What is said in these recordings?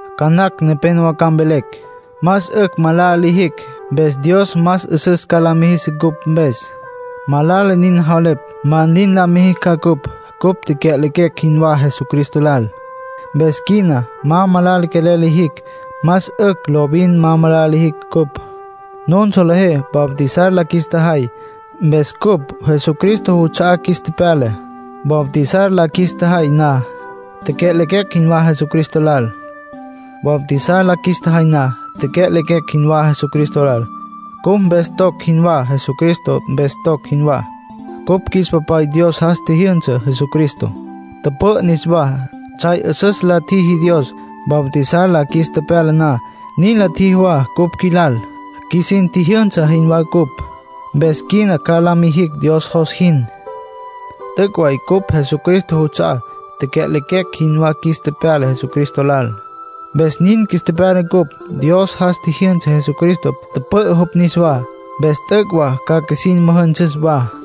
Ca nacj nepénowa ca mvelecj: “Más 'ücj malala lijicj, mpes Dios más 'üsüs ca la mijis cupj mpes”. Malala nin javelepj. ¡Ma nin la mijicj ca cupj! Cupj tecya'lequecj jinwá Jesucristo lal. Mpes quina ma malala quelel lijicj. Más 'ücj lovin ma malala lijicj cupj. Nun solejé bautizar la qjuis tjajay. Mpes cupj Jesucristo juts'a'á qjuis tepyala. Bautizar la qjuis tjajay na, tecya'lequecj jinwá Jesucristo lal. Bautizar la qjuis tjajay na, tecya'lequecj jinwá Jesucristo lal, cupj mpes toc jinwatsja Jesucristo mpes toc jinwá. Cupj qjuis Papay Dios jas tjijyünsa Jesucristo, tüpü'ü niswá. Tsjay 'üsüs la tjiji Dios. Bautizar la qjuis tepyala na, nin la tjiji wa cupj qjuilal. Qjuisin tjijyünsa jinwá cupj. Mpes quina ca la mijicj Dios jos jin. T'üc' way cupj Jesucristo juts'a'á; tecya'lequecj jinwá qjuis tepyala Jesucristo lal, mpes nin qjuis tepyala cupj. Dios jas tjijyünsa Jesucristo, tüpü'ü jupj niswá. Mpes t'üc' wa ca qjuisin müjünsüs wa.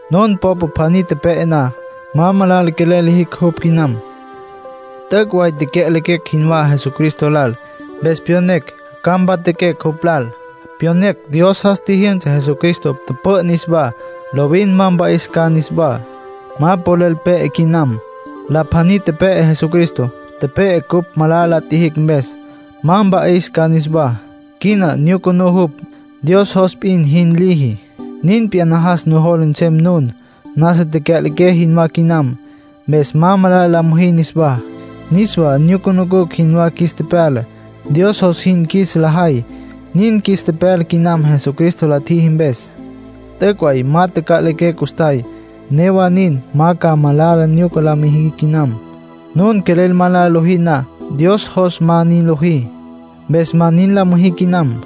Nun popa pjaní tepe'e na, ma malala quelel liji jupj quinam. T'üc' way tecya'lequecj jinwá Jesucristo lal. Mpes pyonecj ca mpatjaquecj jupj lal. Pyonecj Dios jas tjijyünsa Jesucristo, tüpü'ü niswá. Lovin ma mpa'is ca niswá. Ma polel pe'e quinam. La pjaní tepe'e Jesucristo. Tepe'e cupj malala la tjijicj mpes. Ma mpa'is ca niswá. Quina nyucunú jupj. Dios jos p'in jin liji. Nin p'iyá, najas nujola nsem nun nasa taca'liqué jinwá quinam, mpes ma malala la müjí niswá. Niswá nyucunucj jinwá qjuis tepyala, Dios jos jin qjuis la jay. Nin qjuis tepyala quinam Jesucristo la tjiji mpes. T'üc' way ma taca'liqué custjay. Newa nin, ma ca malala nyuca la müjí quinam. Nun quelel malala lojí na, Dios jos ma nin lojí. Mpes ma nin la müjí quinam.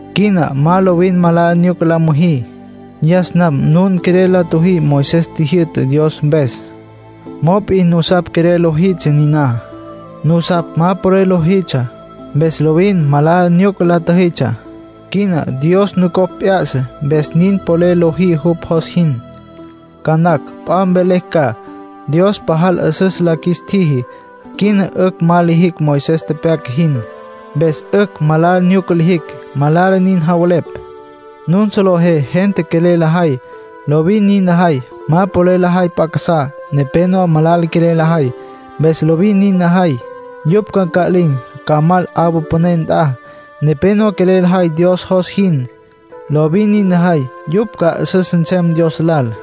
Quina ma lovin malala nyuca la müjí. Yas nam nun quelel la tjüjí Moisés tjijyü'tá Dios mpes. Mop'in nusapj quelel lojitsja niná. Nusapj ma polel lojitsja. Mpes lovin malala nyuca la tjüjitsja. Quina Dios nucopj p'ya'sa, mpes nin polel lojí jupj jos jin. Ca nacj p'a mvelecj ca: “Dios pajal 'üsüs la qjuis tjiji. Quina 'ücj ma lijicj Moisés tepyaca jin. Mpes 'ücj malala nyuca lijicj.” Malala nin javelepj. Nun solejé gente quelel lajay, lovin nin lajay. Ma polel lajay p'a casá. Nepénowa malala quelel lajay, mpes lovin nin lajay. Yupj ca nca'lin̈, ca mal 'awa püné nt'a. Nepénowa quelel lajay Dios jos jin, lovin nin lajay. Yupj ca 'üsüs nsem Dios lal.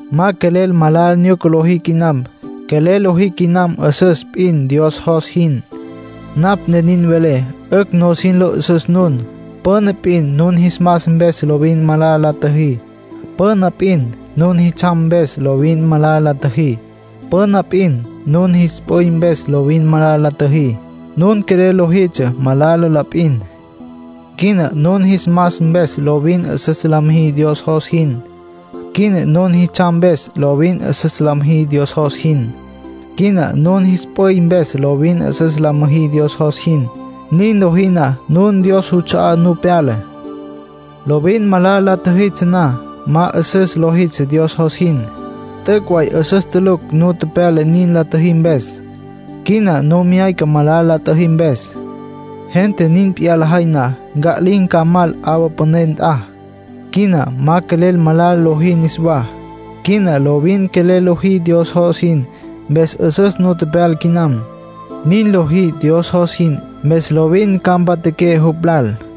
Ma quelel malala nyuca lojí quinam. Quelel lojí quinam 'üsüs p'in Dios jos jin. Napj ne nin velé, 'ücj nusin lo 'üsüs nun. Püna p'in nun jis mas mpes lovin malala la tjüjí. Püna p'in nun jis tsjam mpes lovin malala la tjüjí. Püna p'in nun jis p'üy mpes lovin malala la tjüjí. Nun quelel lojitsja malala la p'in. Quina nun jis mas mpes lovin 'üsüs la müjí Dios jos jin. Quina nun jis tsjam mpes lovin 'üsüs la müjí Dios jos jin. Quina nin jis p'üy mpes lovin 'üsüs la müjí Dios jos jin. Nin lojí na, nun Dios juts'a'á nu pyala. Lovin malala la tjüjitsja na, ma 'üsüs lojitsja Dios jos jin. T'üc' way 'üsüs tulucj nu tepyala nin la tjüjí mpes. Quina nu myayca malala la tjüjí mpes. Gente nin p'iyá lajay na, nca'lin̈ ca, ca mal 'awa püné nt'a. Quina ma quelel malala lojí niswá. Quina lovin quelel lojí Dios jos jin. Mpes 'üsüs nu pyala quinam. Nin lojí Dios jos jin. Mpes lovin ca mpatjaqué jupj lal.